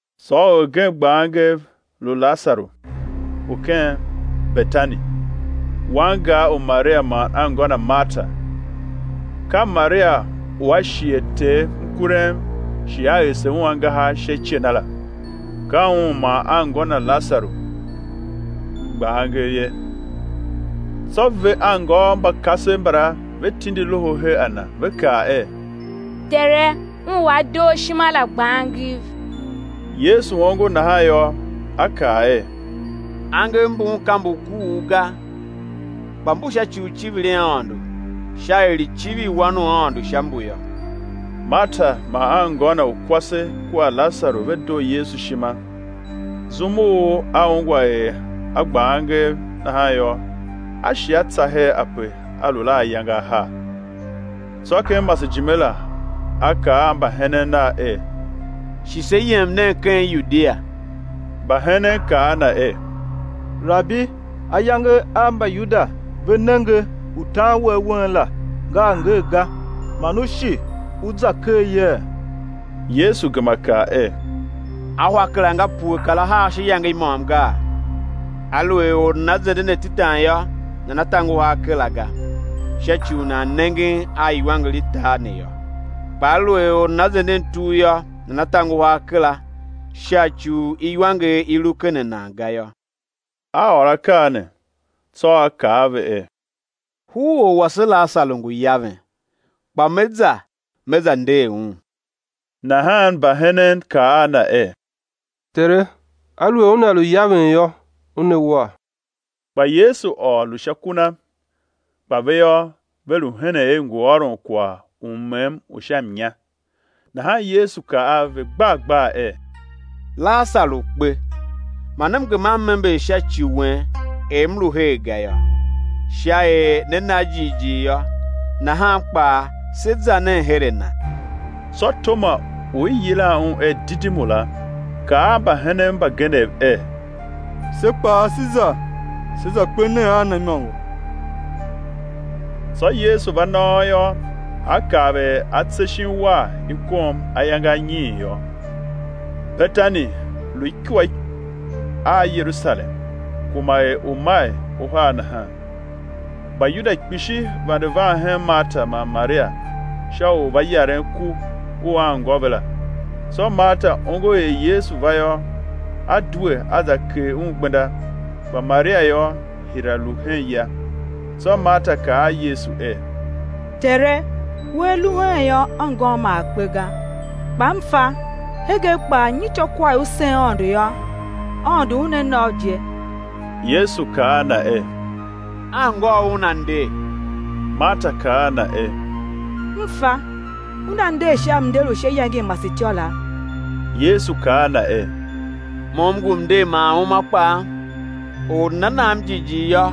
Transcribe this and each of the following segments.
Tsô orgen gba angev, lu Lasaru u ken Betani, wangar u Maria man anngô na Marta. Ka Maria u a shighe Ter mkurem, shi a ese Un angahar sha ice na la; ka un man anngô na Lasaru gba angev ye. Tsô ve anngôôv mba kasev mbala ve tindi loho her a Na, ve kaa er: Tere, un u a doo U ishima la gba angev. Yesu ongo nahan yô, A kaa er: Angev mbun ka mbu kuugh ga, kpa mbu sha ci u icivir i Aôndo sha er i̱ civir Wan u Aôndo sha mbu yô. Marta man anngô na u kwase kua Lasaru ve doo Yesu ishima, Zum u A ungwa er a gba angev nahan yô, A shi A tsa her ape A lu la ayange ahar. Tsô ken masejime la, A kaa a mbahenen Nav er: Shi se yem nen ken Yudia. Mbahenen kaa a Na er: Rabi, ayange a Mbayuda ve nenge u tan We awen la, nga a ngee ga, man U shi U za ker yee? Yesu gema kaa er: Ahwa kera nga pue kar ahar sha iyange i môm gaa? Aluer or nana zenden atetan yô, nana ta nguhar kera ga, sha ci u nan nengen a iwanger i tar ne yô. Kpa aluer or nana zenden tugh yô, nana ta nguhar kera sha ci u iwanger i lu ken a nan ga yô. A ôr akaa ne; tsô A kaa a ve er: Huror wase Lasaru ngu yaven, kpa Me za me za nder un. Nahan mbahenen kaa a Na er: Tere, aluer una lu yaven yô, una war. Kpa Yesu ôr, lu sha ku na; kpa ve yô, ve lu henen er ngu ôron kwagh u mmem u sha mnya. Nahan Yesu kaa a ve gbar gbar er: Lasaru kpe. Man M gema M ember sha ci wen er M lu her ga yô, sha er né na jighjigh yô. Nahan kpaa, se za nen her a na. Tsô Toma u i yilan un er Didimu la, kaa a mbahenen mbagenev er: Se kpaa sé za, se za kpe nen a Na imôngo. Tsô Yesu va nôôr yô, A kav er atse shin uwar i kom ayange anyiin yô. Betani lu ikua a Yerusalem, kuma er umail uhar nahan. Mbayuda kpishi vande van hen Marta man Maria sha u va yaren ku u anngô ve la. Tsô Marta ongo er Yesu va yô, a due a za kegh Un gbenda; kpa Maria yô, hira lu hen ya. Tsô Marta kaa a Yesu er: Tere, Wea lu heen yô, anngôm ma a kpe ga; kpa m fa hegen kpaa nyityô kwagh i U sôn Aôndo yô, Aôndo Una na U je. Yesu kaa a Na er: Anngôu una nder. Marta kaa a Na er: M fa, una nder sha mnder u sha iyange i masetyô la. Yesu kaa a na er: Mo M ngu mnder man uma kpaa; or u nana nam jighjigh yô,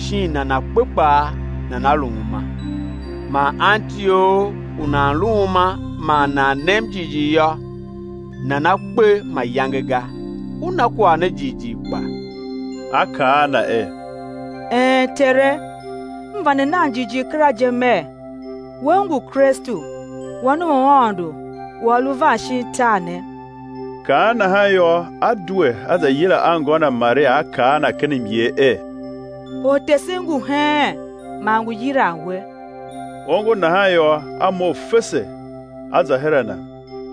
shin nana kpe kpaa, nana lu uma. Man anti or u nan lu uma man nan nem jighjigh yô, nana kpe mayange ga. U na kwagh ne jighjigh kpa? A kaa a Na er: Een Tere, M vande nan jighjigh kera je mer, We U ngu Kristu, Wan u Aôndo u A lu van shin tar ne. Kaan nahan yô, a due, a za yila anngô na Maria a kaa a na ken myer er: Ortesen ngu heen man ngu yilan we. Ongo nahan yô, a mough fese, a za her a Na.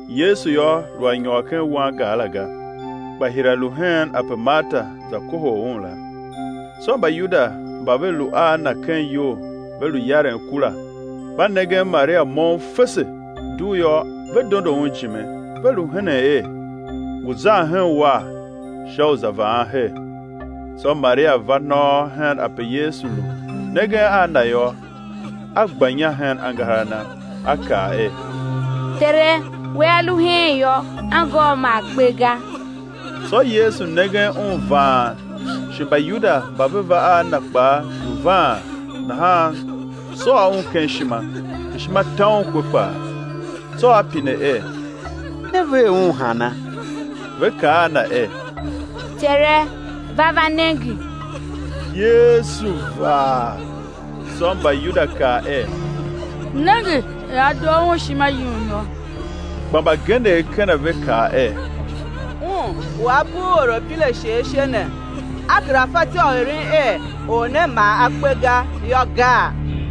Yesu yô, lu a nyôr ken wangar la ga, kpa hira lu hen ape Marta za kohol Un la. Tsô Mbayuda mba ve lu a na ken iyou ve lu yaren ku la mba nengen Maria moughon fese, dugh yô, ve dondo un ijime, ve lu henen er, ngu zan hen uwar sha u za vaan her. Tsô Maria va nôôr hen ape Yesu lu, nengen a Na yô, a gba inya hen angahar a Na, a kaa er: Tere, Wea lu heen yô, anngôm ma a kpe ga. Tsô Yesu nengen un vaan, shi Mbayuda mba ve va a na kpaa lu vaan, nahan sôô Un ken ishima, ishima ta Un kwe kpaa. Tsô A pine er: Ne ver un hana? Ve kaa a Na er: Tere, va va nenge. Yesu vaa. Tsô Mbayuda kaa er: Nenge er a doo Un ishima yum yô. Kpa mbagenev ken a ve kaa er: Un u A bugh orapirashe ashe ne, A kera fatyô u eren er or ne ma a kpe ga yô, gaa?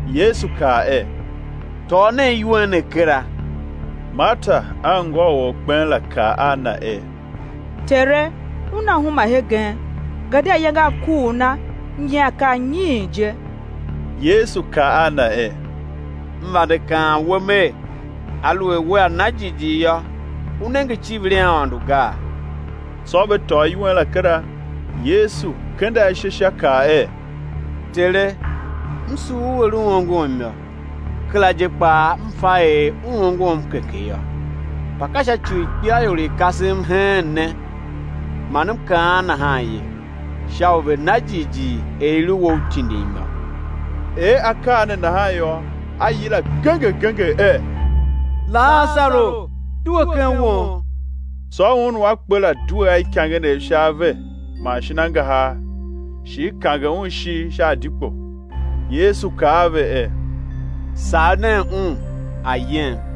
Yesu kaa er: Tôô nen iwen ne kera. Marta, anngô u orkpen la, kaa a Na er: Tere, una huma hegen, gadia ayange a kuugh na nyian ka anyiin je. Yesu kaa a na er: M vande kaan we Mer: Aluer wea na jighjigh yô, u nenge icivir i Aôndo gaa? Tsô ve tôô iwen la kera. Yesu kende ashe sha kaa er: Tere, M sugh U er U ongom yô; kera je kpaa M fa er U ongom keke yô, kpa ka sha ci u ikpelaior i i kasem heen ne man M kaan nahan ye, sha u ve̱ na jighjigh er i lu We U tindim yô. Er akaa ne nahan yô, A yila genger genger er: Lasaru, due ken won! Tsô un u a kpe la due a ikangenev sha ave man shin angahar shi i kange un ishigh sha adikpo. Yesu kaa a ve er: Sagh nen un, a̱ yem.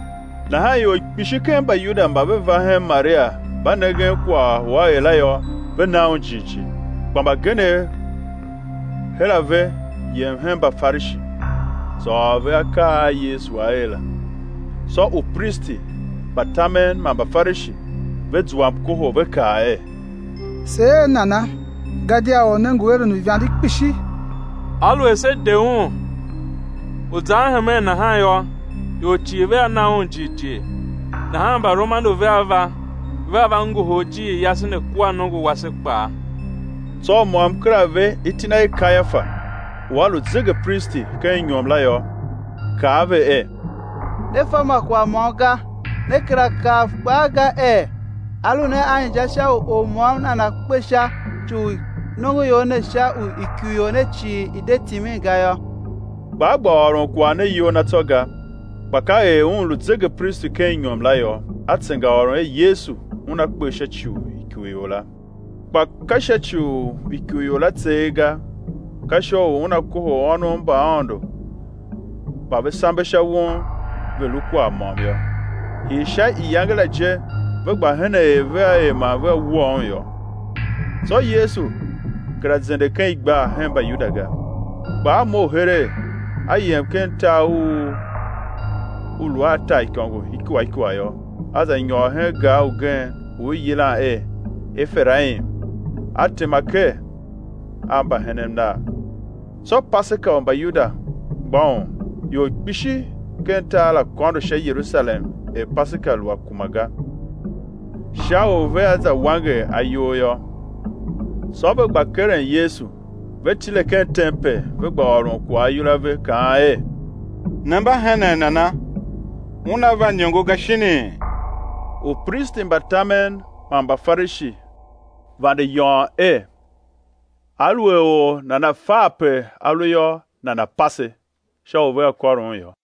Nahan ior kpishi ken Mbayuda mba ve va hen Maria mba nengen kwagh u A er la yô, ve na Un jighjigh. Kpa mbagenev her a ve yem hen Mbafarishi, za ôr ve akaa a Yesu A er la. Tsô upristi mba tamen man Mbafarishi ve zua mkohol, ve kaa er: Se er nana, gadia Or ne ngu eren uivande kpishi. Aluer se de Un u zan hemen nahan yô, ior cii vea na Un jighjigh, nahan Mbaromanu vea va, vea va ngohol ijiir yase ne kua nongo wase kpaa. Tsô u môm ker a ve iti na er Kayafa, u a lu zegepristi ken inyom la yô, kaa a ve er: Ne fa ma kwagh môm ga, ne kera kav kpaa ga er á lu ne a inja u or môm nana kpe sha ci u nongoior ne sha u ikurior ne cii i̱ de timin ga yô. Kpa a gba ôron kwagh ne iyol na tsô ga, kpa ka er un lu zegepristi ken inyom la yô, a tsengaôron er Yesu Una kpe sha ci u ikurior la. Kpa ka sha ci u ikurior la tseegh ga, ka sha u Una kohol ônov mba Aôndo mba ve sambe sha won ve̱ lu kwagh môm yô. Hii sha iyange la je ve gba henen er vea er man vea wua Un yô. Tsô Yesu kera zende ken igbar hen Mbayuda ga, kpa A mough heregh, A yem ken tar u u lu a taaikôngo ikua ikua yô, A za nyôr hen gar ugen u i yilan er Eferaim, A tema ker a mbahenen Nav. Tsô Paseka u Mbayuda mgbôghom, ior kpishi ken tar la kôndo sha Yerusalem er Paseka lu a kuma ga, sha u vea za wanger ayol yô. Tsô ve gba keren Yesu, ve tile ken tempel ve gba ôron kwagh ayol a ve kaan er: Ne mba henen nana? Una va iniongo ga shinii? Upristi mba tamen man Mbafarishi vande yôôn er, aluer or nana fa ape A lu yô, nana̱ pase, sha u vea kôr Un yô.